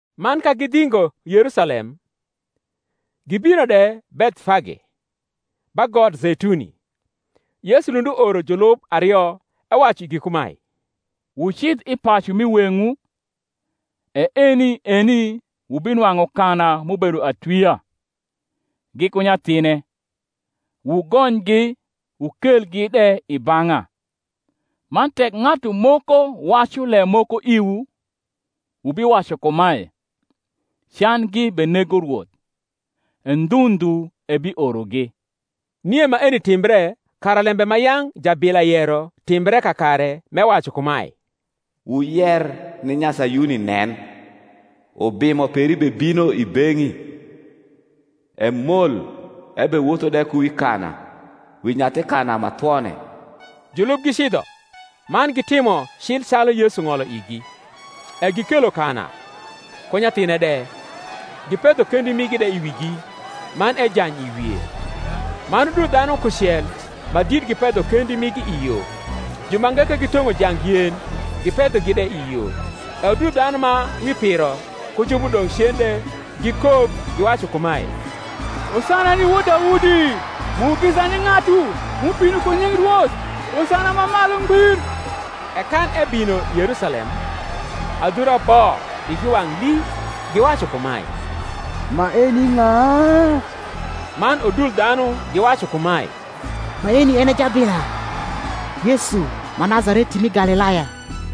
Man ka gidhingo Yerusalem, gibino de Bethfage, ba got Zeituni, Yesu lund uoro julub ario, ewacu igi kumae, Wucidh i pacu m’i weng’wu, e eni eni wubinwang’u kana m’ubedo atwia, giku nyathine: wugonygi, wukelgi de i bang’a. Man tek ng’atu moko wacu lem moko iwu, wubiwacu kumae, Candgi benego Rwoth; e ndhu ndhu ebiorogi. Nie maeni timbre, kara lembe ma yang’ jabila yero timbre kakare, m’ewacu kumae, Wuyer ni Nyasayuni Nen, Ubimo peri bebino i beng’i, Emol ebewotho de ku wi kana, Wi nyathi kana ma thwone. Julub gicidho, man gitimo cil calu Yesu ng’olo igi, e gikelo kana, ku nyathine de, gipedho kendi migi de i wigi; man ejany i wie. Man udul dhanu kucel ma dit gipedho kendi migi i yo; jumange ke gitong’o jang yen, gipedhogi de i yo. E udul dhanu ma wi piro, ku ju m’udong’ cen de, gikok, giwacu kumae, Hosana ni wod Daudi: mugisa ni ng’atu m’ubino ku nying’ Rwoth; Hosana ma malu ngbir. E kan ebino i Yerusalem, adhura bo igi wang’ lii, giwacu kumae, Maeni ng’a? Man udul dhanu giwacu kumae, Maeni en e jabila, Yesu, ma Nazareti mi Galilaya.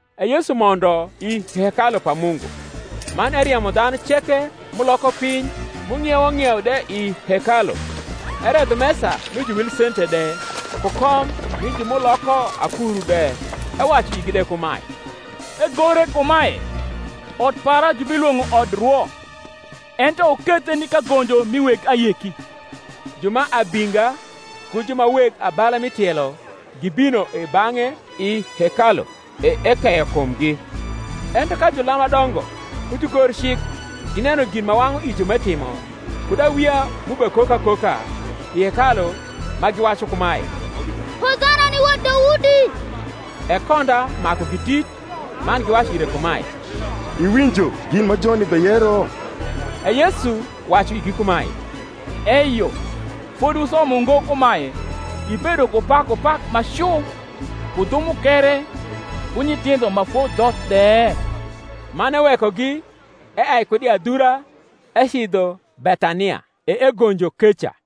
E Yesu mondo i hekalu pa Mungu, man eriemo dhanu ceke m’uloko piny m’ung’iewo ng’ieu de i hekalu, eredho mesa mi juwilsente de, ku kom mi ju m’uloko akuru de; ewacu igi de kumae, Egore kumae, Ot para jubilwong’o odrwo: ento wukethe ni kagonjo mi weg ayeki. Ju ma abinga ku ju ma weg abala m’i tielo gibino i bang’e i hekalu; e ekeyo kumgi. Ento ka julam ma dongo ku jugorcik gineno gin ma wang’u ijo m’etimo, kud awia m’ubekok akoka i hekalu ma giwacu kumae, Hosana ni wod Daudi; e konda makugi dit, man giwacu ire kumae, Iwinjo gin ma joni beyero? E Yesu wacu igi kumae, Eyo: fodi wusomo ngo kumae, Ibedo ku pakupak ma cu ku dhu mukere ku nyithindho ma fodhoth de? Man ewekogi, eai kud i adhura ecidho Bethania, e egonjo keca.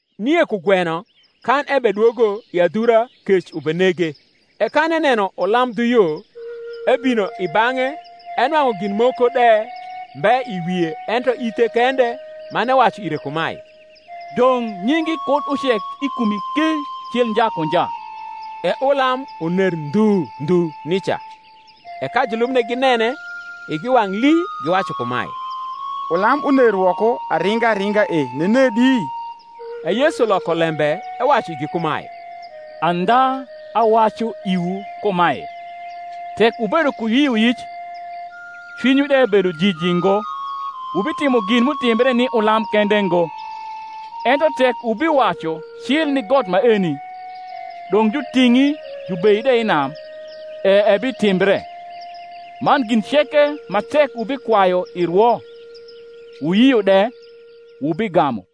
Nie kugweno kan ebedwogo i adhura kec ubenege. E kan eneno ulam dhu yo, ebino i bang’e, enwang’u gin moko de mbe i wie, ento ithe kende; man ewacu ire kumae, Dong’ nyingi kud ucek i kumi ki cil nja ku nja. E ulam uner ndhu ndhu nica. E ka julub ginene, igi wang’ lii, giwacu kumae, Ulam uner woko aringa ringa e nenedi? E Yesu loko lembe ewacu igi kumae, Andha awacu iwu kumae, Tek wubedo ku yioyic, cwinywu de bedo jiji ngo, wubitimo gin m’utimbre ni ulam kende ngo, ento tek wubiwacu cil ni got maeni, Dong’ juting’i jubei de i nam, e ebitimbre. Man gin ceke, ma tek wubikwayu i rwo, wuyio de, wubigamu.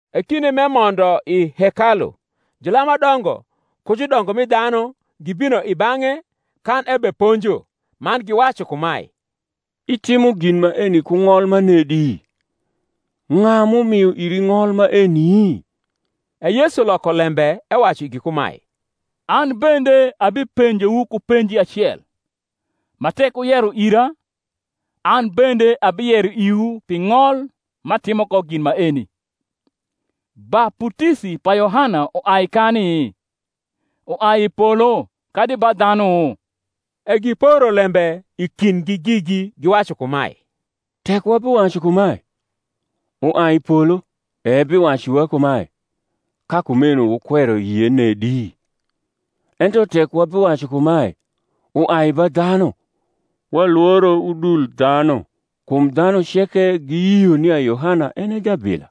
E kinde m’emondo i hekalu, julam ma dongo ku judongo mi dhanu gibino i bang’e kan ebeponjo, man giwacu kumae, Itimo gin maeni ku ng’ol manedi? ng’a m’umio iri ng’ol maeni? E Yesu loko lembe, ewacu igi kumae, An bende abipenjowu ku penji acel, ma tek wuyero ira, an bende abiyero iwu pi ng’ol m’atimo ko gin maeni. Baputisi pa Yohana, uai kani? uai i polo kadi ba dhanu? E giporo lembe i kindgi gigi, giwacu kumae, Tek wabiwacu kumae, Uai i polo; ebiwacu iwa kumae, Ka kumeho wukwero yie nedi? Ento tek wabiwacu kumae, Uai ba dhanu; walworo udul dhanu; kum dhanu ceke giyio nia Yohana en e jabila.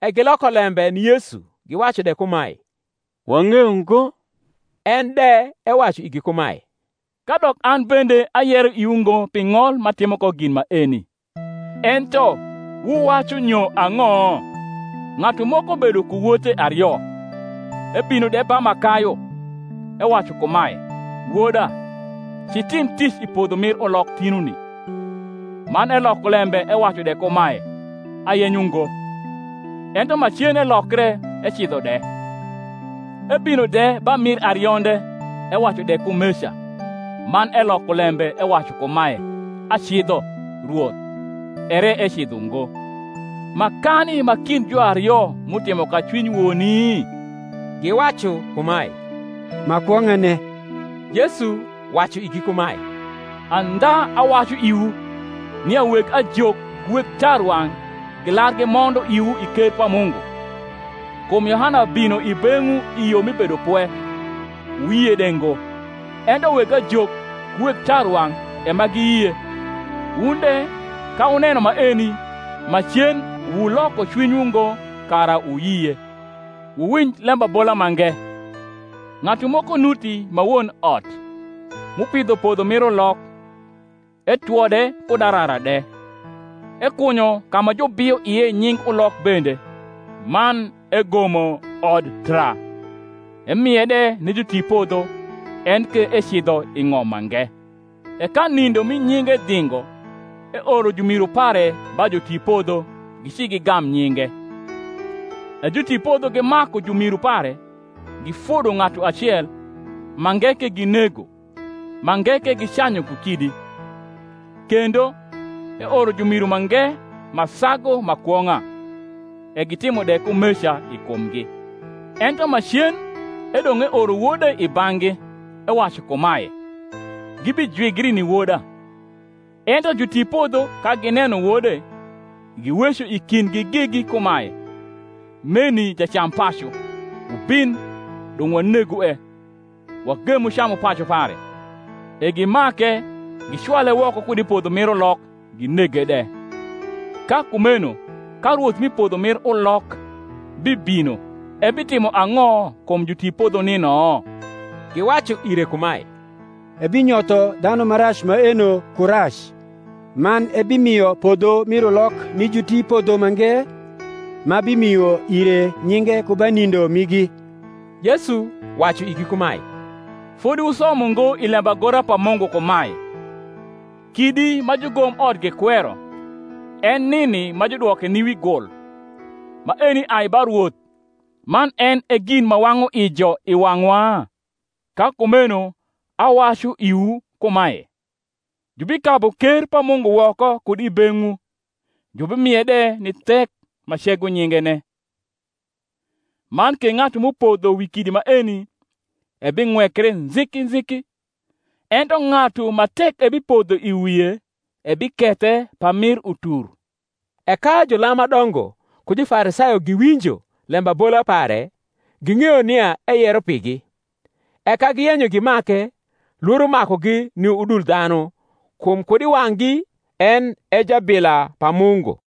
E giloko lembe ni Yesu, giwacu de kumae, Wang’eyo ngo. En de ewacu igi kumae, Kadok an bende ayero iwu ngo pi ng’ol m’atimo ko gin maeni. Ento wuwacu nyo ang’o? Ng’atu moko bedo ku wote ario; ebino de ba ma kayu, ewacu kumae, Woda, ci tim tic i podho mir ulok tinuni. Man eloko lembe ewacu de kumae, Ayenyo ngo; ento macen elokre, ecidho de. Ebino de ba mir arionde, ewacu de kumeca. Man eloko lembe ewacu kumae, Acidho, rwoth: ere ecidho ngo. Makani ma kind juario m’utimo ka cwiny woni? Giwacu kumae, Ma kwong’ane. Yesu wacu igi kumae, Andha awacu iwu, nia weg ajok ku weg tarwang’ gilar gimondo iwu i ker pa Mungu. Kum Yohana bino i beng’wu i yo mi bedopwe, wuyie de ngo; ento weg ajok ku weg tarwang’ e ma giyie; wun de, ka wuneno maeni, macen wuloko cwinywu ngo, kara wuyie. Wuwinj lembabola mange: Ng’atu moko nuti ma won ot, m’upidho podho mir ulok, etwode kud arara de, ekunyo ka ma jubio ie nying ulok bende, man egomo odtra, emie de ni jutipodho, en ke ecidho i ng’om mange. E ka nindo mi nyinge dhingo, eoro jumiru pare ba jutipodho, gici gigam nyinge. E jutipodho gimaku jumiru pare, gifodo ng’atu acel, mange ke ginego, mange ke gicanyu ku kidi. Kendo, eoro jumiru mange ma sagu ma kwong’a: e gitimo de kumeca i kumgi. Ento macen edong’ eoro wode i bang’gi, ewacu kumae, Gibijwigri ni woda. Ento jutipodho, ka gineno wode, giweco i kindgi gigi kumae, Meni jacampacu; wubin, dong’ wanegue, wagemu camupacu pare. E gimake, gicwale woko kud i podho mir ulok, ginege de. Ka kumeno ka rwoth rni podho rnir niok bibino, ebitimo ang’o kum jutipodho nino? Giwacu ire kumae, Ebinyotho dhanu ma rac maeno ku rac, man ebimio podho mir ulok ni jutipodho mange, ma bimio ire nyinge ku ba nindo migi. Yesu wacu igi kumae, Fodi wusomo ngo i lembagora pa Mungu kumae, Kidi ma jugomot gikwero, En nini ma judwoke ni wi gul; Maeni ai ba Rwoth, Man en e gin ma wang’u ijo i wang’wa? Ka kumeno awacu iwu kumae, Jubikabu ker pa Mungu woko kud i beng’wu, jubimie de ni thek ma cego nyingene. Man ke ng’atu m’upodho wi kidi maeni ebing’wekre nziki nziki: ento ng’atu ma tek ebipodho i wie, ebikethe pamir utur. E ka julam ma dongo ku Jufarisayo giwinjo lembabola pare, ging’eyo nia eyero pigi. E ka giyenyo gimake, lworo makugi ni udul dhanu, kum kud i wang’gi en e jabila pa Mungu.